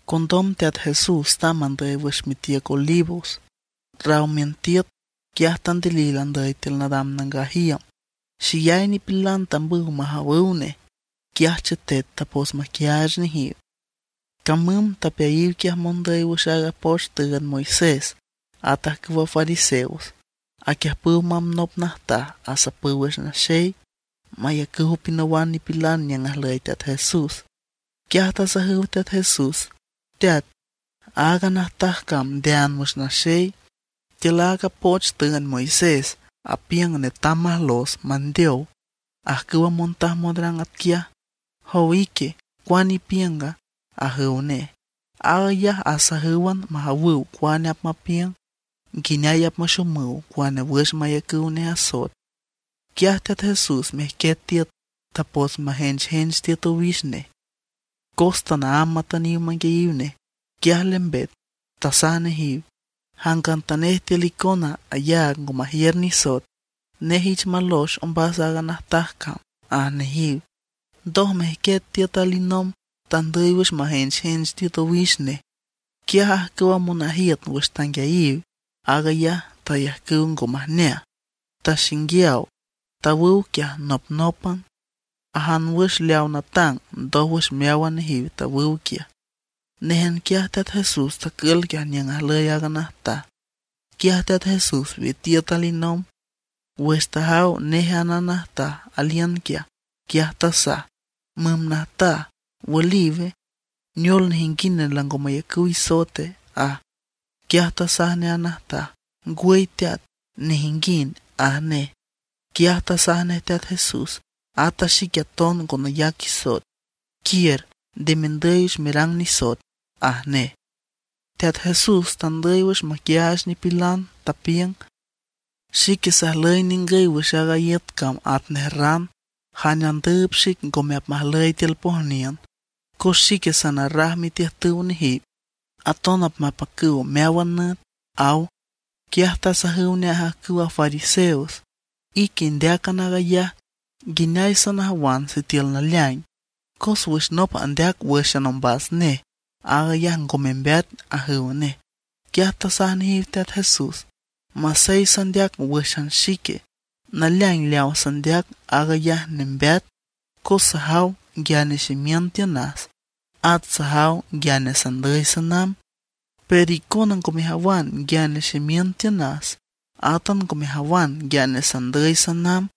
Condom Teat Jesús tamb andüy wüx mitiüc Olivos. Raw miün tiüt, quiaj tandilil andüy tiül nadam nangaj iüm. Xeyay nipilan tambüw majawüw nej; quiaj chetet tapots maquiaach nejiw. Camüm tapeayiw quiaj mondüy wüx aaga poch tüünd Moisés, at ajcüwa fariseos. Aquiüjpüw mamb nop najtaj asapüw wüx naxey, mayacüw pinawan nipilan niüng ajlüy Teat Jesús. Quiaj tasajüw Teat Jesús: ―Teat, aaga najtaj cam ndeaan wüx naxey. Tiül aaga poch tüünd Moisés apiüng netam majlos mandeow ajcüwa montaj monrang atquiaj. Jowa ique, ¿cuane ipiünga? ―ajüw nej. Aag ayaj asajǘwan majawüw cuane apmapiüng, nguineay maxomüw cuane wüx mayacüw nej asoet. Quiaj Teat Jesús mejquiet tiüt, tapots majenchjench tiüt owix nej. Cos tanaámb matüniw manguiayiw nej, quiaj lembet, tasaj nejiw: ―Jangantanej tiül icona ayaag ngo majiür nisoet, nej ich malox ombas aaga najtaj cam ―aj nejiw. Ndoj mejquiet tiüt alinomb, tandüy wüx majenchjench tiüt owix nej. Quiaj ajcüwa monajiüt wüx tanguiayiw aag ayaj tayajcüw ngo majneaj, taxinguiaw; tawüw quiaj nopnópan, ajan wüx leaw natang, ndójwüx meáwan nejiw tawüw quiaj. Néjan quiaj Teat Jesús tacül quiaj niüng ajlüy aaga najtaj. Quiaj Teat Jesús witiüt alinomb. Wüx tajaw néjan a najtaj aliün quiaj, quiaj tasaj: ―Müm najtaj, ¿wüliwe? ¿Neol, nejinguind lango mayacüw isoete? ―aj. Quiaj tasaj nej a najtaj: ―Ngwüy teat, nejinguind ―aj nej. Quiaj tasaj nej Teat Jesús: ―Ata xique aton ngo nayac isoet. Quiür, nde mendüy wüx merang nisoet ―aj nej. Teat Jesús tandüy wüx maquiaach nipilan, tapiüng: ―Xique sajlüy ningüy wüx aaga iüt cam atnej ran. Jane andüüb xic ngome apmajüy tiül pojniün; cos xique sanarraj mitiüjtüw nejiw, aton apmapacüw meáwan nüt ―aw. Quiaj tasajüw nej ajcüwa fariseos: ―Ique indeácan aag ayaj; nguineay sanajawan sitiül naleaing, cos wüx nop andeac wǘxan ombas nej, aag ayaj ngo membeat ―ajüw nej. Quiaj tasaj nejiw Teat Jesús: ―Masey sandeac wǘxan xique, naleaing leaw sandeac aag ayaj nembeat; cos sajaw nguiane ximiün tiünas, at sajaw nguiane sandüy sanamb. Pero icona ngo mejawan nguiane ximiün tiünas, átan ngo mejawan nguiane sandüy sanamb.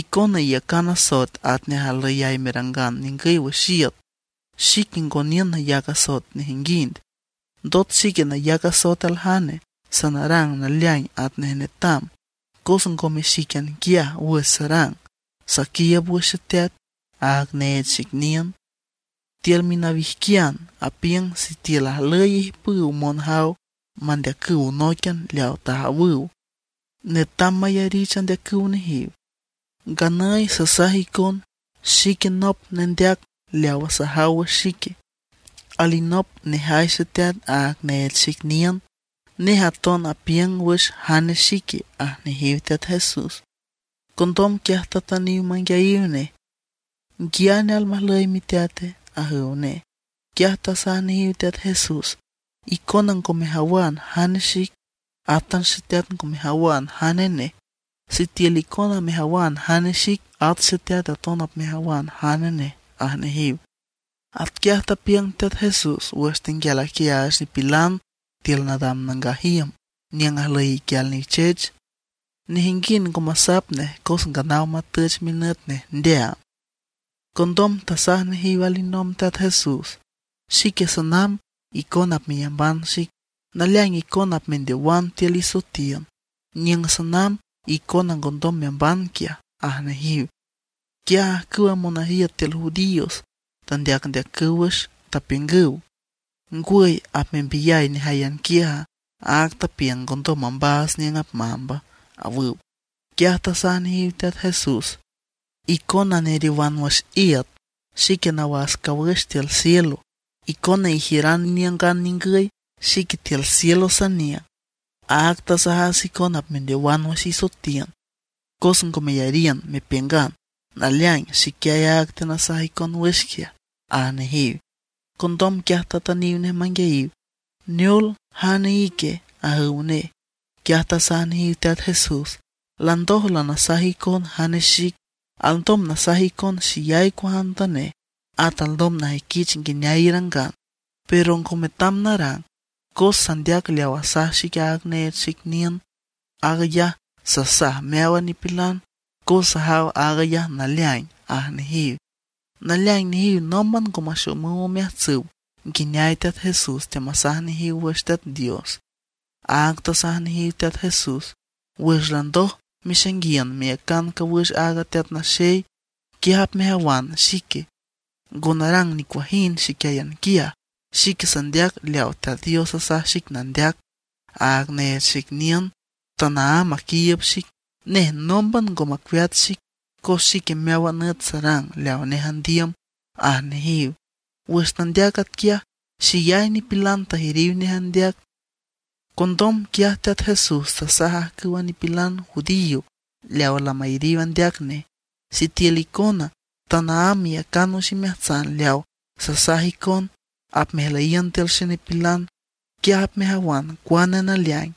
Icona iyacan asoet atnej ajlüyay merangan ningüy wüx iüt. Xique ngo niün nayac asoet nejinguind. Ndot xique nayac asoet aljane, sanarang naleaing atnej netam; cos ngome xíquian quiaj wüx sarang, saquiiüb wüx Xeteat, aaga neech xic niün. Tiül minawijquian apiüng sitiül ajlüy ijpüw monjaw mandeacüw nóiquian leawa tajawüw, netam mayarich andeacüw nejiw. Nganüy sasaj icon xique nop nendeac leawa sajaw wüx xique, alinop nejay Xeteat aaga neech xic niün, nej aton apiüng wüx jane xique ―aj nejiw Teat Jesús. Condom quiaj tatüniw manguiayiw nej: ―¿Nguiane almajlüy miteate? ―ajüw nej. Quiaj tasaj nejiw Teat Jesús: ―Icona ngo mejawan jane xic, átan Xeteat ngo mejawan jane nej. Sitiül icona mejawan jane xic, at Xeteat aton apmejawan jane nej ―aj nejiw. Atquiaj tapiüng Teat Jesús wüx tenguial aquiaach nipilan tiül nadam nangaj iüm niüng ajlüy iquial nichech. Nejinguind ngo masap nej cos nganaw matüch minüt nej ndeaam. Condom tasaj nejiw alinomb Teat Jesús: ―Xique sanamb, icona apmeyamban xic. Naleaing icona apmendeowan tiül isoetiün. Niüng sanamb icona ngondom meamban quiaj ―aj nejiw. Quiaj ajcüwa monajiüt tiül judíos tandeacndeacüw wüx, tapiüngüw: ―¿Ngwüy, apmembiyay nejáyan quiaja, áag tapiüng ngondom mambaats niüng apmamba? ―awüw. Quiaj tasaj nejiw Teat Jesús: ―Icona neriowan wüx iüt; xique nawas cawüx tiül cielo. Icona ijiüran iniüngan ningüy; xique tiül cielo saniüng. Áag tasajas icon apmendeowan wüx isoetiün, cos ngo meyariün mepiüngan naleaing xiquiay aaga teanasaj icon wüx quiaj ―aj nejiw. Condom quiaj tatüniw nej manguiayiw: ―¿Neol, jane ique? ―ajüw nej. Quiaj tasaj nejiw Teat Jesús: ―Landoj lanasaj icon jane xic. Alndom nasaj icon xeyay cuajantanej, at alndom najüiquich nguineay irangan; pero ngo metam narang, cos sandeac leaw asaj xic aaga neech xic niün. Aag ayaj sasaj meáwan nipilan cos sajaw aag ayaj naleaing ―aj nejiw. Naleaing nejiw nómban ngo maxomüw omeajtsüw nguineay Teat Jesús teamasaj nejiw wüx Teat Dios. Áag tasaj nejiw Teat Jesús: ―Wüx landoj mexainguiün meyacan cawüx aaga Teat Naxey, quiaj apmejawan xique. Ngo narang nicuajind xiquiáyan quiaj, xique sandeac leaw Teat Dios asaj xic nandeac. Aaga neech xic niün tanaámb aquiiüb xic; nej nómban ngo macueat xic cos xique meáwan nüt sarang leaw nej andiüm ―aj nejiw. Wüx tandeac atquiaj xeyay nipilan tayariw nej andeac. Condom quiaj Teat Jesús tasaj ajcüwa nipilan judío leawa lamayariw andeac nej: ―Sitiül icona tanaámb meyacan wüx imeajtsan leaw sasaj icon, apmejlüyiün tiül xenipilan. Quiaj apmejawan cuane naleaing;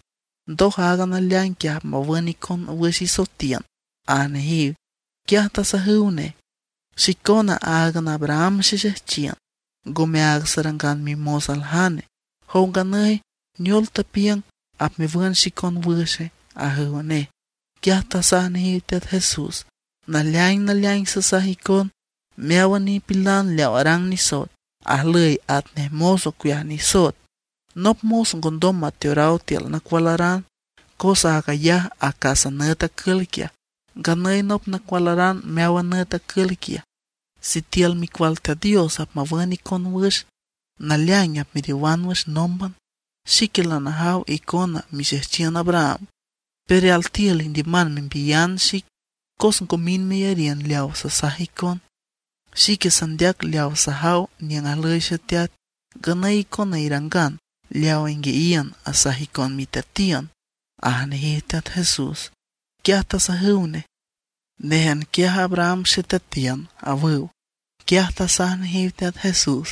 ndoj aaga naleaing quiaj apmawün icon wüx isotiün ―aj nejiw. Quiaj tasajüw nej: ―Xicona áagan Abraham xexejchiün, ngome áag sarangan mimos aljane. Jow nganüy ¿neol tepiüng apmewün xicon wüxe? ―ajüw nej. Quiaj tasaj nejiw Teat Jesús: ―Naleaing naleaing sasaj icon, meáwan nipilan leaw arang nisoet ajlüy atnej mos ocueaj nisoet. Nop mos ngondom mateoraw tiül nacualaran cos aag ayaj acas nüt acül quiaj. Nganüy nop nacualaran meáwan nüt acül quiaj. Sitiül Micual Teat Dios apmawün icon wüx, naleaing apmeriowan wüx nómban. Xique lanajaw icona mixejchiün Abraham; pero altiül indiüman membiyan xic cos ngo mind meyariün leawa sasaj icon. Xique sandeac leawa sajaw niüng ajlüy Xeteat; nganüy icona irangan leawa inguiayiün asaj icon miteatiün ―aj nejiw Teat Jesús. Quiaj tasajüw nej: ―Néjan quiaj Abraham xeteatiün ―awüw. Quiaj tasaj nejiw Teat Jesús: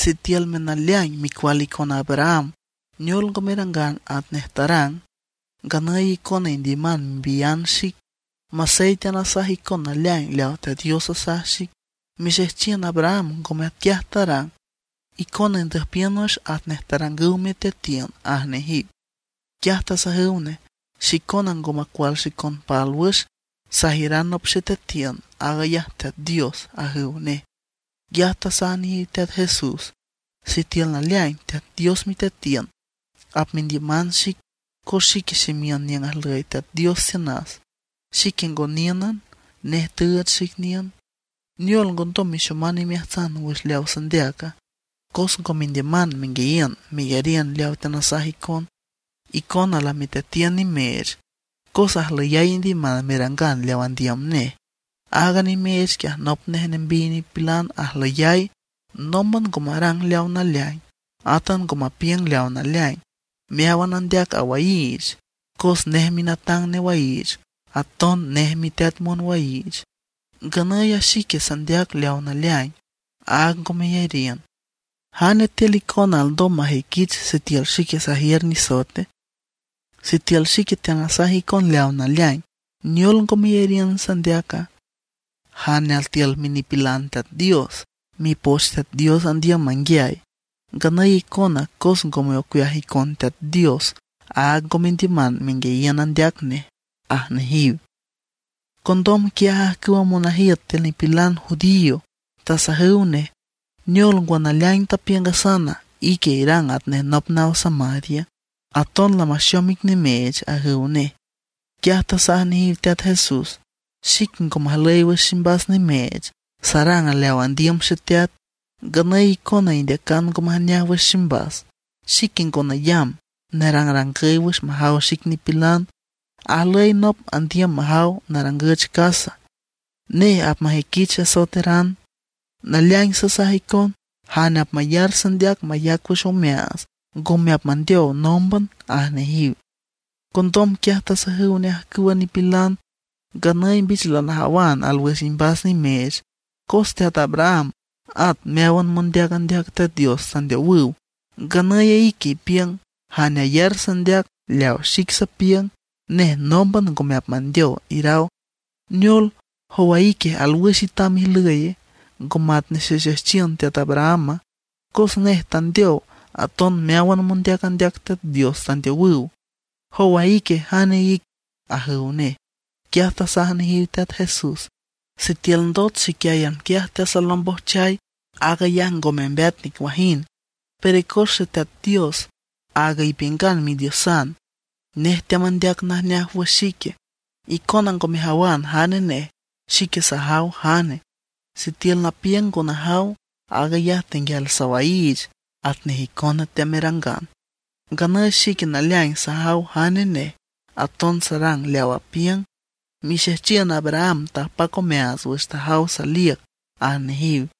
―Sitiülme naleaing micual icon Abraham, neol ngo merangan atnej tarang. Nganüy icona indiüman membiyan xic masey teanasaj icon naleaing leaw Teat Dios asaj xic. Mixejchiün Abraham ngome atquiaj tarang. Icona indüjpiün wüx atnej tarangüw miteatiün ―aj nejiw. Quiaj tasajüw nej: ―Xicona ngo macual xicon pálwüx; sajiüran nop xeteatiün, aag ayaj Teat Dios ―ajüw nej. Quiaj tasaj nejiw Teat Jesús: ―Sitiül naleaing Teat Dios miteatiün, apmendiüman xic, cos xique ximiün niüng ajlüy Teat Dios tiünas. Xique ngo níünan, nej tüüch xic niün. ¿Neol ngondom mexoman imeajtsan wüx leawa sandeaca? Cos ngo mendiüman menguiayiün meyariün leawa teanasaj icon. Icona lamiteatiün nimeech cos ajlüyay indiüman merangan leaw andiüm nej. Aaga nimeech quiaj nop nej nembiy nipilan ajlüyay. Nómban ngo marang leaw naleaing, átan ngo mapiüng leaw naleaing. Meáwan andeac awaiich, cos nej minatang newaiich, aton nej miteat monwaiich. Nganüy a xique sandeac leaw naleaing, áag ngo meyariün. ¿Jane tiül icona alndom majüiquich sitiül xique sajiür nisoete? Sitiül xique teanasaj icon leaw naleaing, ¿neol ngo meyariün sandeaca? Jane altiül minipilan Teat Dios, Mipoch Teat Dios andiüm manguiay. Nganüy icona cos ngome ocueaj icon Teat Dios, áag ngo mendiüman menguiayiün andeac nej ―aj nejiw. Condom quiaj ajcüwa monajiüt tiül nipilan judío tasajüw nej: ―¿Neol ngwa, naleaing tapiüngasan, ique irang atnej nop naw Samaria? ¡Aton lamaxom ic nimeech! ―ajüw nej. Quiaj tasaj nejiw Teat Jesús: ―Xique ngo majlüy wüx ximbas nimeech. Sarang leaw andiüm Xeteat, nganüy icona indeacan ngo majneaj wüx ximbas. Xique ngo nayamb nerangrangüy wüx majaw xic nipilan. Ajlüy nop andiüm majaw narangüch casa. Nej apmajüiquich asoeteran. Naleaing sasaj icon, jane apmayar sandeac mayac wüx omeaats ngome apmandeow nómban ―aj nejiw. Condom quiaj tasajüw nej ajcüwa nipilan: ―Nganüy mbich lanajawan alwüx imbas nimeech. Cos teat Abraham at meáwan mondeac andeac Teat Dios tandeowüw; nganüy ique ipiüng: “Jane ayar sandeac leaw xic sapiüng, nej nómban ngome apmandeow”, iraw. ¿Neol, jowa ique, alwüx itam ijlüy, ngo matnej xexejchiün teat Abrahama? Cos nej tandeow, aton meáwan mondeac andeac Teat Dios tandeowüw. ¿Jowa ique, jane ic? ―ajüw nej. Quiaj tasaj nejiw Teat Jesús: ―Sitiül ndot xiquiáyan quiaj teasalombojchay, aag ayaj ngo membeat nicuajind. Pero cos Xeteat Dios, áaga ipiüngan Midiosan, nej teamandeac najneaj wüx xique. Icona ngo mejawan jane nej; xique sajaw jane. Sitiül napiüng ngo najaw, aag ayaj tenguial sawaiich atnej icona teamerangan. Nganüy xique naleaing sajaw jane nej, aton sarang leaw apiüng. Mixejchiün Abraham tapac omeaats wüx tajaw saliüc ―aj nejiw.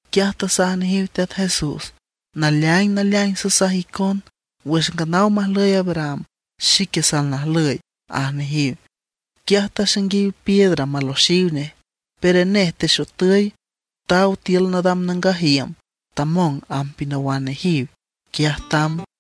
Quiaj tasaj nejiw Teat Jesús: ―Naleaing naleaing sasaj icon, wüx nganaw majlüy Abraham, xique salnajlüy ―aj nejiw. Quiaj taxainguiw piedra maloxiw nej; pero nej texotüy, taw tiül nadam nangaj iüm, tamong amb pinawan nejiw, quiaj tamb.